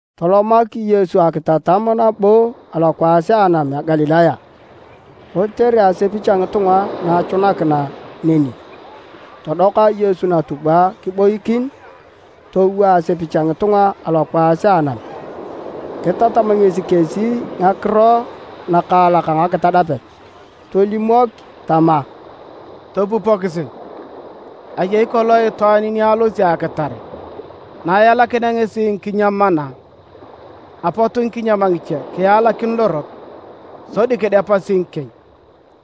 Tolomak Yesu akitatam nabo alokwaas a anam a Galilaya. Kotere asepich a ngitunga na achunakina neni, todoka Yesu natubwa kiboikin. Towo asepich a ngitunga alokwaas a anam. Kitatam ngesi kesi ngakiro nakaalak a ngakitadapet tolimok tama: “Topupokisi! Ayei kolong itwaan ni alosi akitare. Na elakinea ngesi ngikinyam mana, apot ngikinyam ngiche kialakin lorot, sodi kidepasi ngikieny.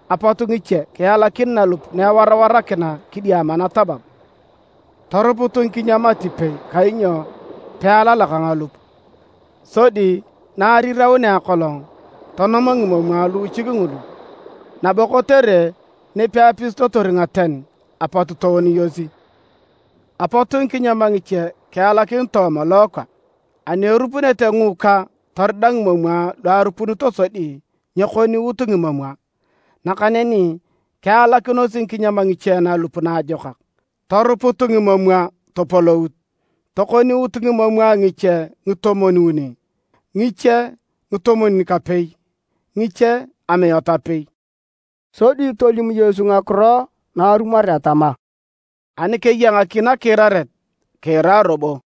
Apot ngiche kialakin nalup na ewarawarakina kidiama natabab. Toruput ngikinyam atipei kainyo pealalak ngalup. Sodi na ariraunea akolong tonom ngimomwa luuchik ngulu, nabo kotere nipeapisitotor ngaten apot tooniyosi. Apot ngikinyam ngiche kialakin tooma lookwa. Ani erupunete ngiikwa torida ngimomwa lu arupunito sodi nyekoniut ngimomwa. Nakaneni kialakinos ngikinyam ngiche nalup naajokak, toruput ngimomwa topolout, tokoniut ngimomwa: ngiche ngitomwon-uni, ngiche ngitomwon-kapei, ngiche amiat apei.” Sodi tolim Yesu ngakiro narumoret tama, “Ani keya ngaki nakiiraret, kiira robo!”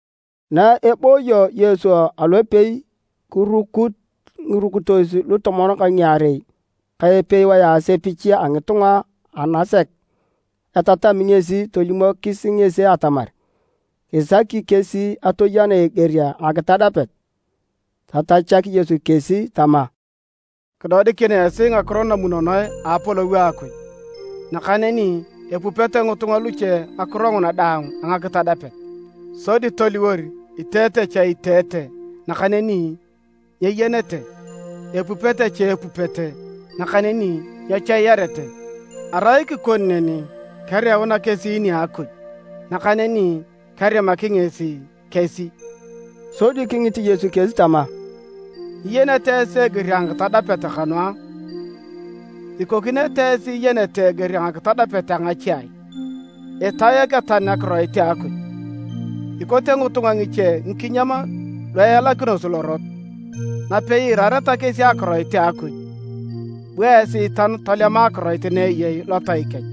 Na ebooyo Yesu alopei, kirukut ngirukitos lutomon ka ngiarei ka epewae asepich a ngitunga anasek etatami ngesi tolimokis ngesi atamar kisaki kesi atoyena eger a ngakitadapet. Tatachak Yesu kesi tama, “Kidodikin esi ngakiro namunonoe a Apolou a Akuj. Nakaneni epupete ngitunga luche ngakiro nguna daang a ngakitadapet, sodi toliwor, ‘Iteete cha iteete, nakaneni nyeyenete, epupete cha epupete nakaneni nyechoiarete. Arai kikoni neni, kereuna kesi nia Akuj, nakaneni kerimaki ngesi kesi.’” Sodi kingit Yesu kesi tama, “Nyiyenete esi eger a ngakitadapet kanu a? Ikokinete esi iyenete eger a ngakitadapet a ngache ai? Itae eketan Akiroit a Akuj. Ikote ngitunga ngiche ngikinyam lu ealakinosi lorot, napei iirareta kesi Akiroit a Akuj, bu Esiitan tolema akiroit na eyei lotai kech.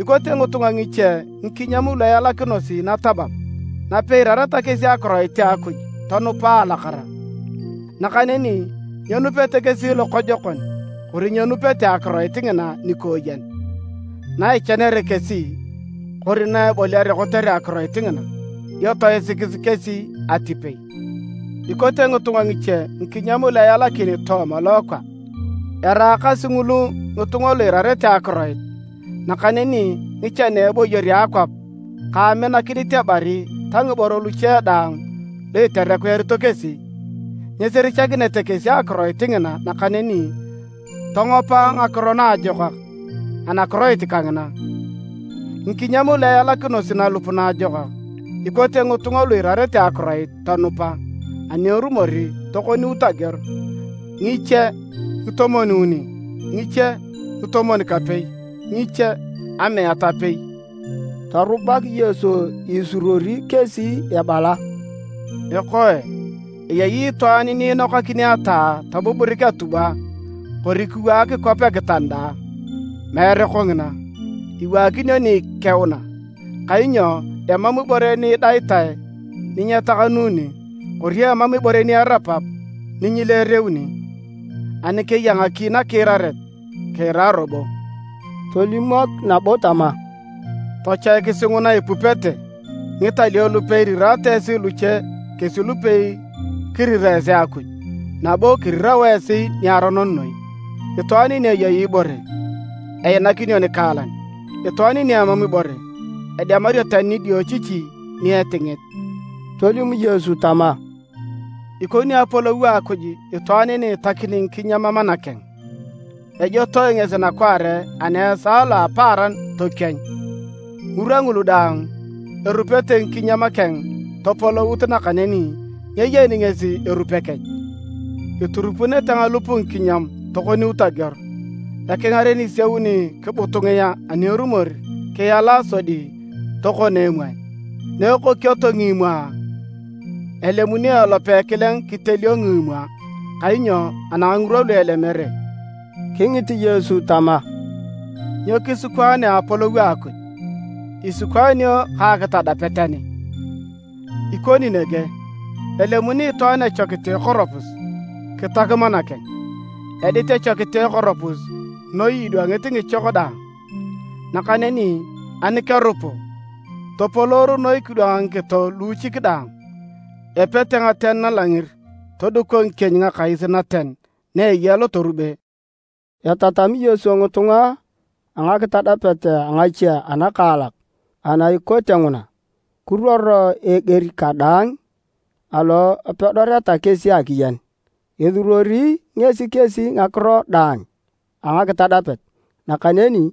Ikote ngitunga ngiche ngikinyam lu ealakinosi natabab. Napei iirareta kesi Akiroit a Akuj tonupa a alakara. Nakaneni nyenupete kesi lokojokon kori nyenupete akiroit ngina nikooyen. Na ichanere kesi kori na eboliare kotere akiroit ngina, dio toisikis kesi atipei. Ikote ngitunga ngiche ngikinyam lu ealakin tooma lookwa. Eraakasi ngulu ngitunga lu iirarete akiroit, nakaneni ngichan a eboyor a akwap ka aminakinit ebari ta ngiboro luche daang lu iterekuyarito kesi, nyisirichakinete kesi akiroit ngina nakaneni tongopa ngakiro naajokak anakiroit kangina. Ngikinyam lu ealakinosi nalup naajokak ikote ngitunga lu iirarete akiroit tonupa, ani erumor tokoniut ageor, ngiche ngatomwon-uni, ngiche ngatomwon-kapei, ngiche amiat apei.” Torubak Yesu isuruori kesi ebala, “Ekoe, eyei itwaan ni inokakini ataa tobuburik atubwa kori kiwaak kwap ekitanda a? Meere kongina, iwaakinio ni ikeuna. Kainyo emam ibore ni idaitae ni nyetakanuni, kori emam ibore ni erapap ni nyileereuni. Ani keya ngaki nakiiraret kiira robo!” Tolimok nabo tama, “Tochoikisi nguna ipupete! Ngitalio lupei iriraata esi luche kesi lupei kirira esi Akuj nabo kirirao esi niaronon noi. Itwaan ni eyei ibore, einakinio nikaalan, itwaan ni emam ibore, edemario tani nidiochichi ni etingit.” Tolim Yesu tama, “Ikoni Apolou a Akuj itwaan ni itakini ngikinyam mana keng. Ejotoe ngesi nakwaare ani esaa lo a apaaran tokienyu. Ngirwa ngulu daang, erupete ngikinyam keng topolout nakaneni nyeyeni ngesi erupe kech. Iturupunete ngalup ngikinyam tokoniut ageor. Ekingaren isiauni kibutungia ani erumor kiala sodi tokon emwae. Na ekokioto ngimomwa, elemuni elope ekileng kitelio ngimomwa, kainyo anang ngirwa lu elemere.” Kingit Yesu tama, “Nyo kisikwaanea Apolou a Akuj? Isikwaanio ka akitadapet ani? Ikoni nege. Elemuni itwaan echokit a ekoropus kitak mana keng. Edit echokit a ekoropus noi idwangit ngichok daang. Nakaneni ani kerupu, topoloor noi kidwang ngikito luuchik daang. Epete ngaten nalangir toduko ngikieny ngakais naten na eya lotorube.” Etatami Yesu ngitunga a ngakitadapet a ngache anakaalak ana ikote nguna, kiruor a eger kadaang alo apedorete kesi akiyen. Esuruori ngesi kesi ngakiro daang a ngakitadapet. Nakaneni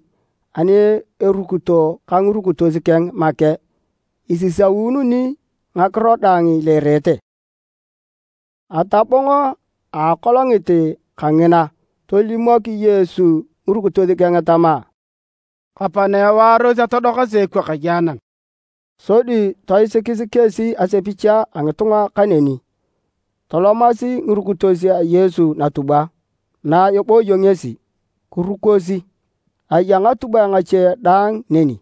ani erukito ka ngirukitos keng make, esisaununi ngakiro daang ileerete. Atabong a akolongit kangina, tolimok Yesu ngirukitos keng tama, “Kapana ewaaros atodokasi ekwakaye anam.” Sodi toisikis kesi asepich a ngitunga kaneni. Tolomasi ngirukitos a Yesu natubwa na ebooyo ngesi kirukosi. Aya ngatubwae ngache dang neni.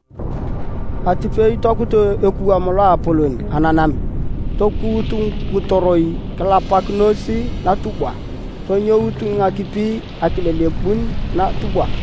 Atipei tokut ekuwam loapolon ananam. Tokuut ngitoroi kilapakinos natubwa tonyout ngakipi akilelebun natubwa.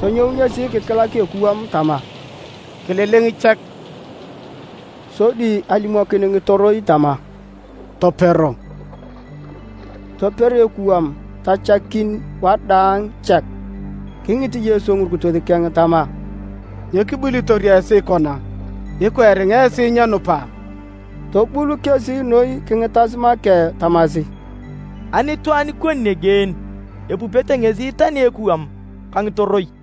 Tonyou ngesi kikilak ekuwam tama, “Kililing chek!” Sodi alimokin ngitoroi tama, “Topero!” Toper ekuwam tachakin wadaang chek. Kingit Yesu ngirukitos keng tama, “Nyo kibulitor esi kona? Ikwa eringa esi nyenupa?” Tobul kesi noi kingitas make tamasi, “Ani itwaan ikoni nege en? Epupete ngesi tani ekuwam ka ngitoroi!”